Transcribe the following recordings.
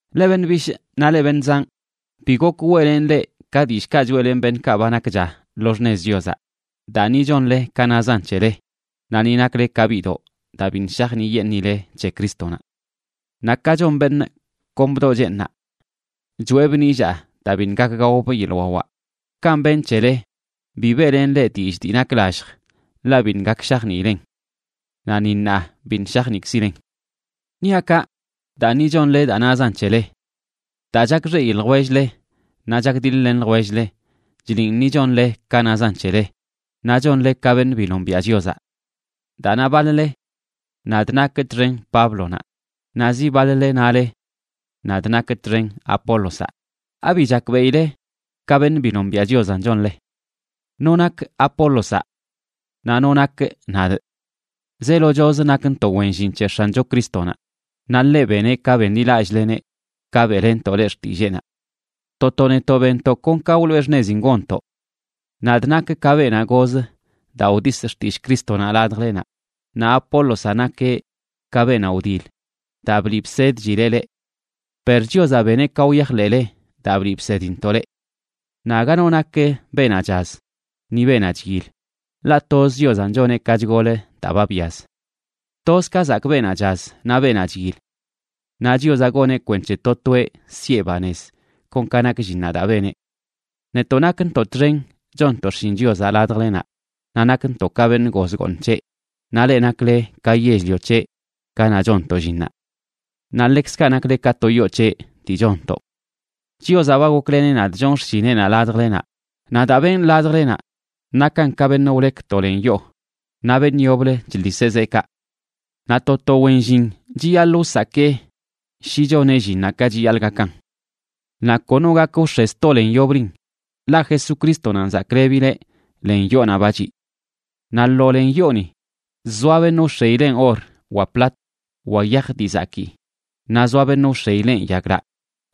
Leꞌ beṉꞌ bishꞌ naꞌ leꞌ beṉꞌ zanꞌ, bi gok weꞌlenꞌ leꞌ ka dillꞌkaꞌ choeꞌlenꞌ beṉꞌkaꞌ ba nakcha lo xṉez Chiozaꞌ, daa ni chonle ka nazan c̱hele, naꞌ ni nakle ka biꞌdoꞌ daa biṉꞌ shajniꞌyeṉꞌile c̱he Crístonaꞌ. Naꞌ ka chon beṉꞌ kon bdoꞌ cheeṉnaꞌ choꞌebꞌ nillaa daa biṉꞌ gak gaobꞌ yeḻꞌ wawaꞌ, kanꞌ benꞌ c̱hele, bi beꞌlenꞌ leꞌ dillꞌ dii nak lallj, ḻaꞌ biṉꞌ gak shajniilen. Naꞌ ni ṉaa biṉꞌ shajniꞌkzilen. Niaꞌ kaꞌ, daa ni chonle daa nazan c̱hele. Daa chakxeꞌi ljwell-le, naꞌ chakdiḻ-len ljwell-le, chliꞌn ni chonle ka nazan c̱hele naꞌ chonle ka beṉꞌ bi nombiaꞌ Chiozaꞌ. Daa na baḻ-le: “Nadꞌ nakꞌ txen Páblonaꞌ”, naꞌ zi baḻ-le nale: “Nadꞌ nakꞌ txen Apólozaꞌ”, ¿abi chakbeꞌile ka beṉꞌ bi nombiaꞌ Chiozanꞌ chonle? ¿No nak Apólozaꞌ? Naꞌ ¿no nakꞌ nadꞌ? Zeelochoz nakntoꞌ wen llin c̱he X̱ancho Crístonaꞌ, naꞌ ḻeꞌ beneꞌ ka benḻilallꞌleneꞌ ka beꞌlenntoꞌ leꞌ xtilleenaꞌ. To to netoꞌ benntoꞌ kon ka wloꞌe xṉezin gonntoꞌ. Nadꞌ nakꞌ ka beenaꞌ goz daa wdisꞌ xtillꞌ Crístonaꞌ ladjlenaꞌ, naꞌ Apólozaꞌ nakeꞌ ka beenaꞌ wdil, daa bliꞌ bsedchileꞌ leꞌ. Per Chiozaꞌ beneꞌ ka wyajḻeꞌle daa bliꞌ bsedintoꞌ leꞌ. Naꞌ aga no nak beenaꞌ chaz ni beenaꞌ chyil, ḻaꞌ toz Chiozanꞌ choneꞌ ka chgol daa ba byaz. Toz ka zakꞌ beenaꞌ chaz naꞌ beenaꞌ chyil. Naꞌ Chiozaꞌ goneꞌ kwenc̱he to toeꞌ siꞌe banez kon ka nak llinnaꞌ daa beneꞌ. Netoꞌ nakntoꞌ txen chonntoꞌ xshin Chiozaꞌ ladjlenaꞌ, naꞌ nakntoꞌ ka beṉꞌ goz gooṉ c̱heꞌ, naꞌ leꞌ nakle ka yell-lio c̱heꞌ ganaꞌ chonntoꞌ llinnaꞌ. Naꞌ ḻekzkaꞌ nakle ka to yoo c̱heꞌ dii chonntoꞌ. Chiozaꞌ ba gokleneꞌ nadꞌ chonꞌ xshineꞌnaꞌ ladjlenaꞌ, naꞌ daa benꞌ ladjlenaꞌ nakan ka beṉꞌ wlek to len yoo, naꞌ beṉꞌ yoblə chḻiseꞌ zeekaꞌ. Naꞌ to to wen llin chiyaḻꞌ wsakee shi choneꞌ llinnaꞌ ka chiyaḻꞌ gakan. Naꞌ kono gak wx̱e sto len yoblin, ḻaꞌ Jesucrístonanꞌ zaklebileꞌ len yoonaꞌ ba chiꞌ. Naꞌ lo len yooni, zoa beṉꞌ wx̱eileꞌn or wa plat, wa yaj dii zakii, naꞌ zoa beṉꞌ wx̱eileꞌn yaglaꞌ,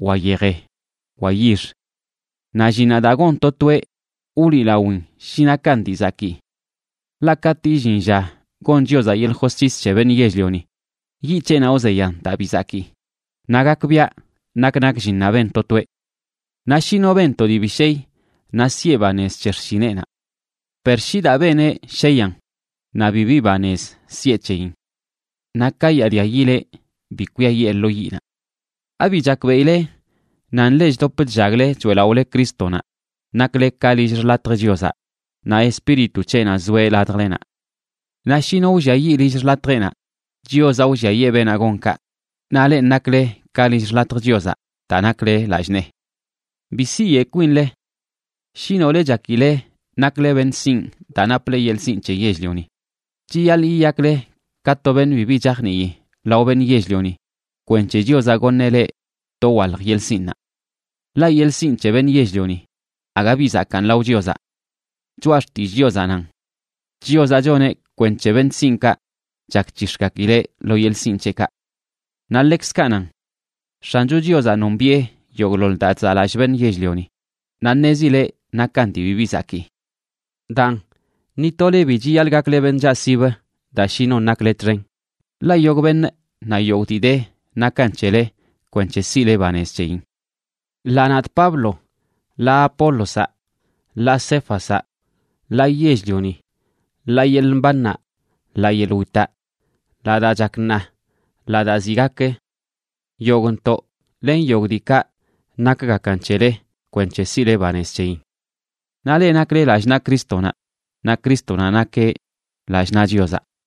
wa yeje, wa yix. Naꞌ llinnaꞌ daa gon to toeꞌ wliꞌlawin shi nakan dii zakii. Ḻaꞌ katꞌ illin lla gon Chiozaꞌ yeḻꞌ josc̱his c̱he beṉꞌ yell-lioni, yiꞌ c̱heꞌnaꞌ wzeyan daa bi zakii, naꞌ gakbiaꞌ nak nak llinnaꞌ ben to toeꞌ. Naꞌ shi no ben to dii bi shey, naꞌ siꞌe banez c̱he xshineꞌnaꞌ. Per shi daa beneꞌ sheyan, naꞌ bibi banez siꞌe c̱heyin. Naꞌ kayaadia yileꞌ bi kwiayee lo yiꞌnaꞌ. ¿Abi chakbeꞌile nan leꞌ chdop chllagle choeꞌlaꞌole Crístonaꞌ nakle ka lill xḻatj Chiozaꞌ, naꞌ Espíritu c̱heꞌnaꞌ zoeꞌ ladjlenaꞌ? Naꞌ shi no wlliayiꞌ lill xḻatjeꞌnaꞌ, Chiozaꞌ wlliayee beenaꞌ gon kaꞌ, naꞌ lenꞌ nakle ka lill xḻatj Chiozaꞌ daa nakle lallꞌ nee. Bi siyeꞌ kwinle. Shi nole chakile nakle beṉꞌ sinꞌ daa naple yeḻꞌ sinꞌ c̱he yell-lioni, chiyaḻꞌ yiyakle ka to beṉꞌ bibi chajnii lao beṉꞌ yell-lioni kwenc̱he Chiozaꞌ goṉeꞌ leꞌ dowalj yeḻꞌ sinꞌnaꞌ. Ḻaꞌ yeḻꞌ sinꞌ c̱he beṉꞌ yell-lioni aga bi zakaan lao Chiozaꞌ. Choꞌa Xtillꞌ Chiozaꞌ nan: “Chiozaꞌ choneꞌ kwenc̱he beṉꞌ sinꞌkaꞌ chakc̱hix̱gakileꞌ lo yeḻꞌ sinꞌ c̱heꞌkaꞌ.” Naꞌ ḻekzkaꞌ nan: “X̱ancho Chiozaꞌ nombiꞌe yogꞌḻoḻ daa chzaꞌlallꞌ beṉꞌ yell-lioni, naꞌ ṉezileꞌ nakan dii bibi zakii.” Daan, ni tole bi chiyaḻꞌ gakle beṉꞌ chaꞌsib daa shi non nakle txen, ḻaꞌ yogꞌ beṉꞌ naꞌ yogꞌ dii de nakan c̱hele kwenc̱he siꞌle banez c̱heyin: ḻaa nadꞌ Pablo, ḻaa Apólozaꞌ, ḻaa Céfazaꞌ, ḻaa yell-lioni, ḻaa yeḻꞌ mbannaꞌ, ḻaa yeḻꞌ witaꞌ, ḻaa daa chak ṉaa, ḻaa daa ziꞌ gak. Yogꞌntoꞌ len yogꞌ diikaꞌ nakgakan c̱hele kwenc̱he siꞌle banez c̱heyin. Naꞌ leꞌ nakle lallꞌ naꞌ Crístonaꞌ, naꞌ Crístonaꞌ nakeꞌ lallꞌ naꞌ Chiozaꞌ.